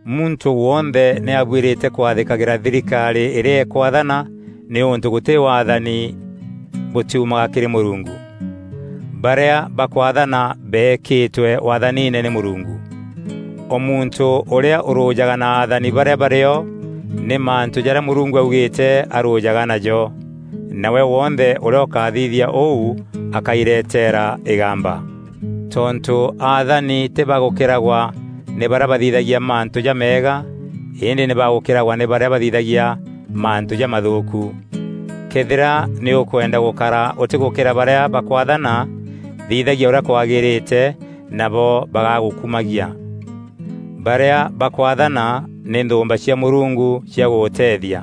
Muntû wonthe nî abuîrîte kwathîkagîra thirikarî îrîa îkwaathana nîûntû gûtî waathani bûtiumaga kîrî Mûrungu. Barîa bakwaathana beekîtwe waathaniine nî Mûrungu. O muntû ûrîa ûrûjaga na athani barîa barîo nî mantû jarîa Mûrungu augîîte arûjaga najo; nawe wonthe ûrîa ûkathithia ûu akairetera îgamba. Tontû athani tî ba gûkîragwa nî barîa bathithagia mantû jameega îndî nî ba gûkîragwa nî barîa bathithagia mantû jamathûûku. Këethîra nî ûkwenda gûkara ûtîgûkîra barîa bakwaathana, thithagia ûrîa kwagîrîte nabo bagagûkumagia. Barîa bakwaathana nî nthûûmba cia Mûrungu cia gûgûteethia.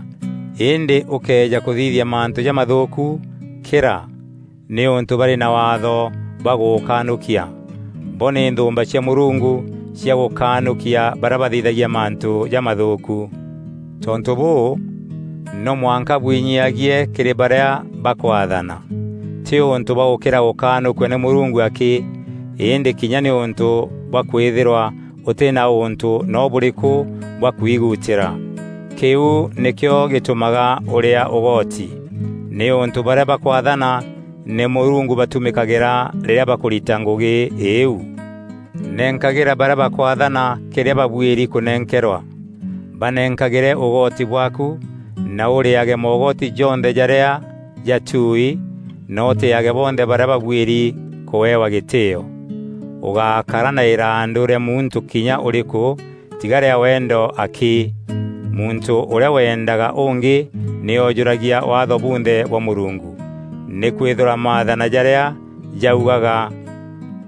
Îndî ûkëeja kûthithia mantû jamathûûku, kîra, nîûntû barî na waatho bwa gûgûkanûkia. Bo nî nthûûmba cia Mûrungu, cia gûkanûkia barîa bathithagia mantû jamathûûku. Tontû bûû, no mwanka bwinyiagie kîrî barîa bakwaathana, tî ûntû bwa gûkîra gûkanûkua nî Mûrungu akî, îndî kinya nîûntû bwa kwîthîrwa ûtî na ûntû noo bûrîkû bwa kwiguutîra. Kîu nîkîo gîtûmaga ûreaa ûgoti, nîûntû barîa bakwaathana nî Mûrungu batumîkagîra rîrîa bakûrita ngûgî îîu. Nenkagîra barîa bakwaathana kîrîa babuîri kûnenkerwa. Banenkagîre ûgoti bwaaku na ûrîage moogoti jonthe jarîa jatui na ûtîîage bonthe barîa babuîri kûewa gîtîîo. Ûgákara na îrandû rîa muntû kinya ûrîkû tiga rîa wendo akî. Muntû ûrîa wendaga ûngî nî ojûragia Waatho bunthe bwa Mûrungu. Nîkwîthîrwa maathana jarîa jaugaga,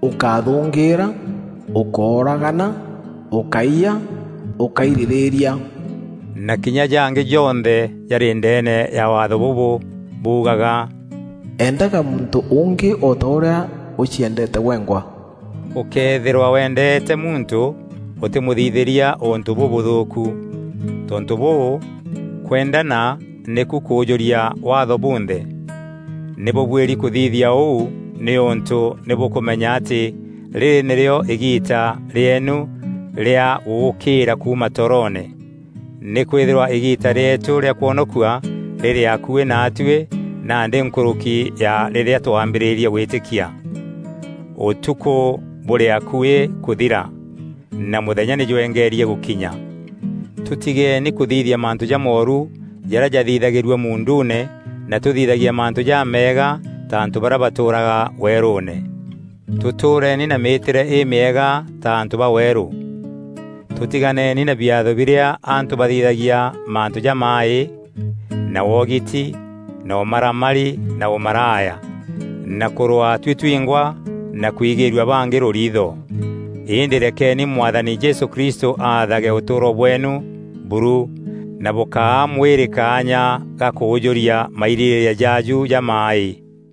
“Ûkáthûngîîra; Ûkóragana; Ûkáiya; Ûkáirîrîria;” na kinya jangî jonthe jarî ndeene ya Waatho bûbû buugaga, “Endaga muntû ûngî o ta ûrîa ûciendeete gwengwa.” Ûkëethîrwa wendeete muntû, ûtîmûthithîria ûntû bûbûthûûku. Tontû bûû, kwendana nîku kûûjûria Waatho bunthe. Nî bûbuîri kûthithia ûu nîûntû nî bûkûmenya atî rîrî nîrîo îgiita rîeenu rîa gûûkîîra kuuma toroone. Nîkwîthîrwa îgiita rîeetû rîa kwonokua rîrî akuî naatuî nandî nkûrûki ya rîrîa twambîrîrie gwîtîkia. Ûtukû bûrî akuî kûthira, na mûthenya nî jwengeerie gûkinya. Tûtigeeni kûthithia mantû jamooru jarîa jathithagîrua muunduune na tûthithagie mantû jameega ta antû barîa batûûraga weerûûne. Tûtûreeni na mîîtîre îmîega ta antû ba weerû. Tûtiganeeni na biatho birîa antû bathithagia mantû jamaaî, na wogiti, na ûmaramari na ûmaraya, na kûrwaa tuî twîngwa na kwigîrua bangî rûriitho. Îndî rekeni Mwathani Jesû Kristû aathage ûtûûro bweenu buru na bûkáa mwîrî kaanya ga kûûjûria mairîrîîria jaaju jamaaî.